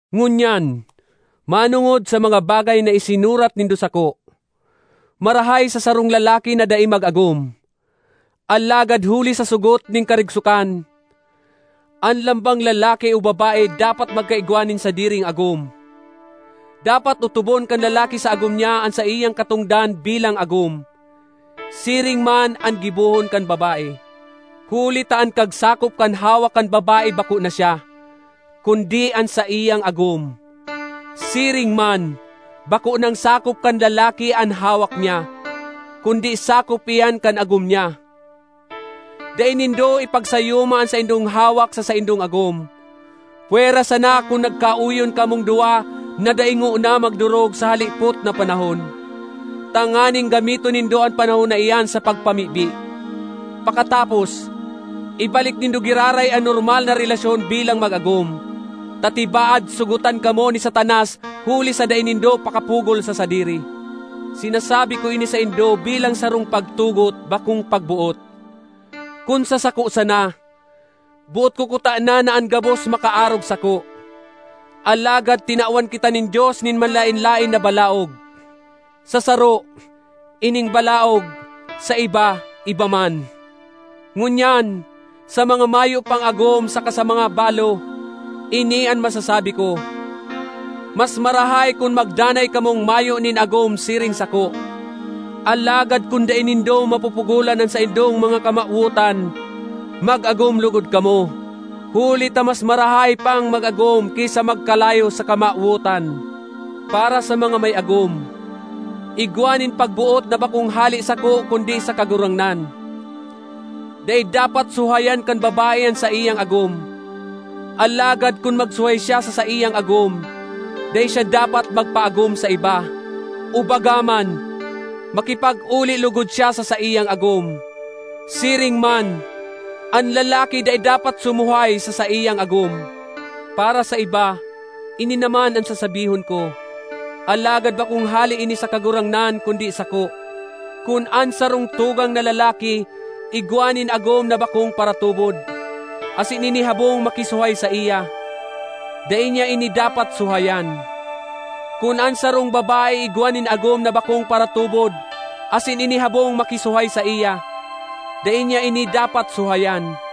Ngunyan, manongod sa mga bagay na isinurat nindo sako. Marahay sa sarong lalaki na dai mag-agom. Alagad huli sa sogot nin karigsokan, an lambang lalaki o babae dapat magkaigwa nin sadiring agom. Dapat otobon kan lalaki sa agom niya an saiyang katongdan bilang agom; siring man an gibohon kan babae. Huli ta an kagsakop kan hawak kan babae bako na siya, kundi an saiyang agom. Siring man, bako nang sakop kan lalaki an hawak niya, kundi sakop iyan kan agom niya. Dai nindo ipagsayuma an saindong hawak sa saindong agom, pwera sana kun nagkaoyon kamong duwa na dai ngona magdorog sa halipot na panahon, tanganing gamiton nindo an panahon na iyan sa pagpamibi. Pakatapos, ibalik nindo giraray an normal na relasyon bilang mag-agom, ta tibaad sogotan kamo ni Satanas huli sa dai nindo pakapugol sa sadiri. Sinasabi ko ini saindo bilang sarong pagtugot, bakong pagboot. Kun sa sako sana, boot ko kutana na an gabos makaarog sako; alagad tinawan kita nin Dios nin manlaen-laen na balaog—sa saro, ining balaog; sa iba, iba man. Ngunyan, sa mga mayo pang agom saka sa mga balo, ini an masasabi ko: mas marahay kun magdanay kamong mayo nin agom siring sako. Alagad kun dai nindo mapupugolan an saindong mga kamawotan, mag-agom logod kamo, huli ta mas marahay pang mag-agom ki sa magkalayo sa kamawotan. Para sa mga may agom, igwa nin pagboot na bakong hale sako kundi sa Kagurangnan: dai dapat suhayan kan babae an saiyang agom. Alagad kun magsuhay siya sa saiyang agom, dai siya dapat magpaagom sa iba; o baga man, makipag-oli logod siya sa saiyang agom. Siring man, an lalaki dai dapat sumuhay sa saiyang agom. Para sa iba, ini naman an sasabihon ko (alagad bakong hale ini sa Kagurangnan, kundi sako): kun an sarong tugang na lalaki igwa nin agom na bakong paratubod, asin ini habong makisuhay saiya, dai niya ini dapat suhayan. Kun an sarong babae igwa nin agom na bakong paratubod asin ini habong makisuhay saiya, dai niya ini dapat suhayan.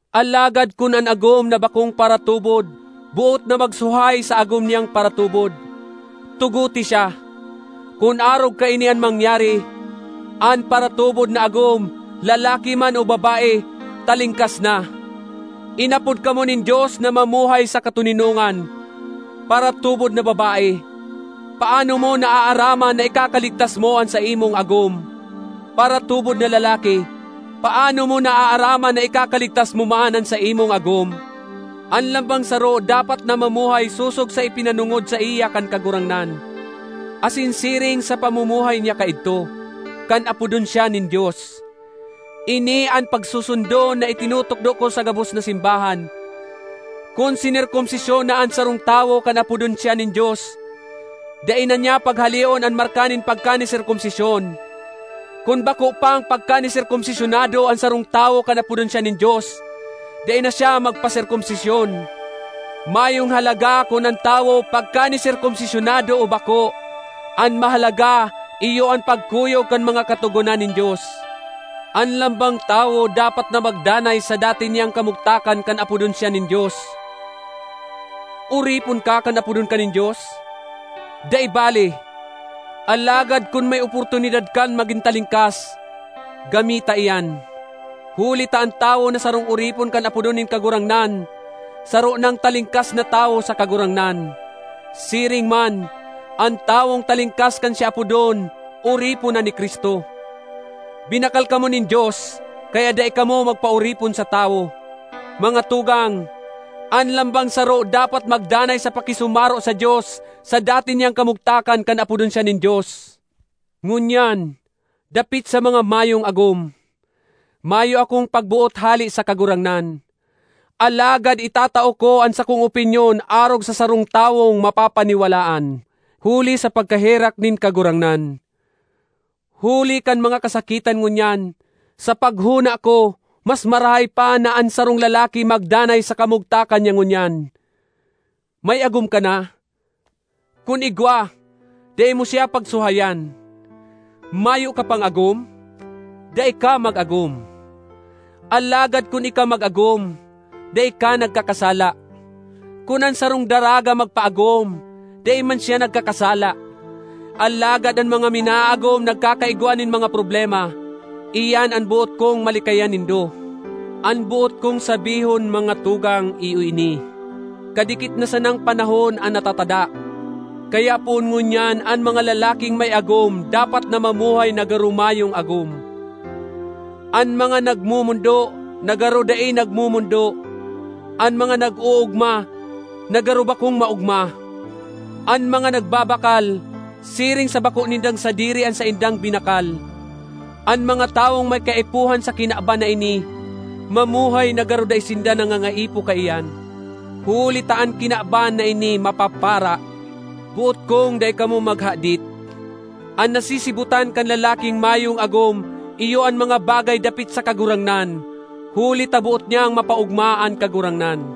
Alagad kun an agom na bakong paratubod boot na magsuhay sa agom niyang paratubod, tugote siya. Kun arog kaini an mangyari, an paratubod na agom, lalaki man o babae, talingkas na. Inapod kamo nin Dios na mamuhay sa katoninongan. Paratubod na babae, paano mo naaaraman na ikakaligtas mo an saimong agom? Paratubod na lalaki, paano mo naaaraman na ikakaligtas mo man an saimong agom? An lambang saro dapat na mamuhay sosog sa ipinanongod saiya kan Kagurangnan, asin siring sa pamumuhay niya kaidto, kan apodon siya nin Dios. Ini an pagsusundon na itinutukdo ko sa gabos na simbahan. Kun sinerkomsisyon na an sarong tawo kan apodon siya nin Dios, dai na niya paghaleon an marka nin pagkaniserkomsisyon; kun bako pang pagkaniserkomsisyonado an sarong tawo kan apodon siya nin Dios, dai na siya magpaserkomsisyon. Mayong halaga kun an tawo pagkaniserkomsisyonado o bako; an mahalaga iyo an pagkuyog kan mga katogonan nin Dios. An lambang tawo dapat na magdanay sa dati niyang kamugtakan kan apodon siya nin Dios. Oripon ka kan apodon ka nin Dios? Dai bale; alagad kun may oportunidad kang magin talingkas, gamita iyan. Huli ta an tawo na sarong oripon kan apodon nin Kagurangnan, saro nang talingkas na tawo sa Kagurangnan; siring man, an tawong talingkas kan siya apodon, oripon na ni Cristo. Binakal kamo nin Dios, kaya dai kamo magpaoripon sa tawo. Mga tugang, an lambang saro dapat magdanay sa pakisumaro sa Dios sa dati niyang kamugtakan kan apodon siya nin Dios. Ngunyan, dapit sa mga mayong agom, mayo akong pagboot hale sa Kagurangnan, alagad itatao ko an sakong opinyon arog sa sarong tawong mapapaniwalaan, huli sa pagkaherak nin Kagurangnan. Huli kan mga kasakitan ngunyan, sa paghona ko mas marahay pa na an sarong lalaki magdanay sa kamugtakan niya ngunyan. May agom ka na? Kun igwa, dai mo siya pagsuhayan. Mayo ka pang agom? Dai ka mag-agom. Alagad kun ika mag-agom, dai ka nagkakasala; kun an sarong daraga magpaagom, dai man siya nagkakasala. Alagad an mga minaagom nagkakaigwa nin mga problema—iyan an boot kong malikayan nindo. An boot kong sabihon, mga tugang, iyo ini: kadikit na sanang panahon an natatada. Kaya poon ngunyan an mga lalaking may agom dapat na mamuhay na garo mayong agom; an mga nagmomondo, na garo dai nagmomondo; an mga nag-oogma, na garo bakong maogma; an mga nagbabakal, siring sa bako nindang sadiri an saindang binakal; an mga tawong may kaipuhan sa kinaban na ini, mamuhay na garo dai sinda nangangaipo kaiyan, huli ta an kinaban na ini mapapara. Boot kong dai kamo maghadit. An nasisibotan kan lalaking mayong agom iyo an mga bagay dapit sa Kagurangnan huli ta boot niyang mapaogma an Kagurangnan.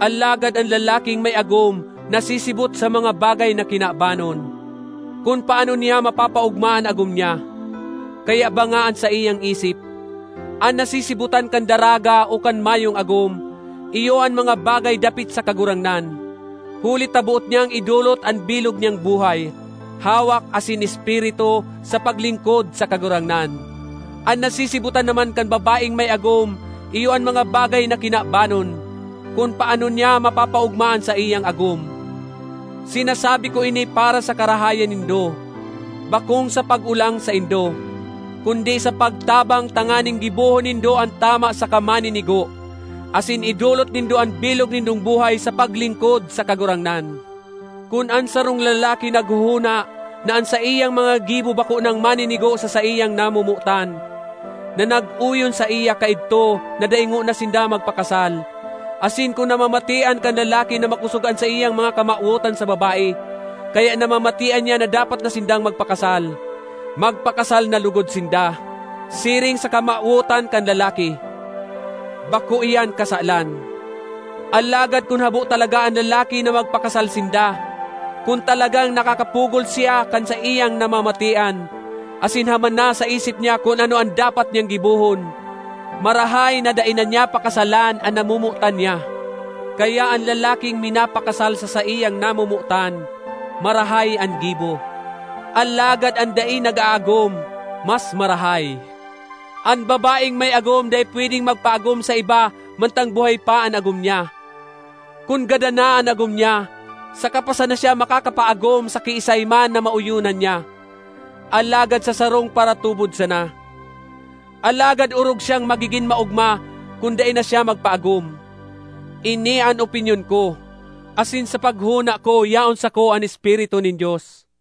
Alagad an lalaking may agom nasisibot sa mga bagay na kinabanon, kun paano niya mapapaogma an agom niya; kaya banga an saiyang isip. An nasisibotan kan daraga o kan mayong agom, iyo an mga bagay dapit sa Kagurangnan, huli ta boot niyang idolot an bilog niyang buhay, hawak asin espiritu, sa paglingkod sa Kagurangnan. An nasisibotan naman kan babaeng may agom iyo an mga bagay na kinabanon, kun paano niya mapapaogma an saiyang agom. Sinasabi ko ini para sa karahayan nindo, bakong sa pag-olang saindo, kundi sa pagtabang tanganing gibohon nindo an tama saka maninigo, asin idolot nindo an bilog nindong buhay sa paglingkod sa Kagurangnan. Kun an sarong lalaki naghohona na an saiyang mga gibo bako nang maninigo sa saiyang namomotan, na nag-oyon saiya kaidto na dai ngona sinda magpakasal; asin kun namamatean kan lalaki na makosog an saiyang mga kamawotan sa babae, kaya namamatean niya na dapat na sindang magpakasal, magpakasal na logod sinda, siring sa kamawotan kan lalaki. Bako iyan kasalan. Alagad kun habo talaga an lalaki na magpakasal sinda, kun talagang nakakapugol siya kan saiyang namamatean, asin haman na sa isip niya kun ano an dapat niyang gibohon, marahay na dai na niya pakasalan an namomotan niya. Kaya an lalaking minapakasal sa saiyang namomotan, marahay an gibo; alagad an dai nag-aagom, mas marahay. An babaeng may agom dai pwedeng magpaagom sa iba mantang buhay pa an agom niya. Kun gadan na an agom niya, saka pa sana siya makakapaagom sa kiisay man na maoyonan niya, alagad sa sarong paratubod sana. Alagad orog siyang magigin maogma kun dai na siya magpaagom. Ini an opinyon ko, asin sa paghona ko yaon sako an Espiritu nin Dios.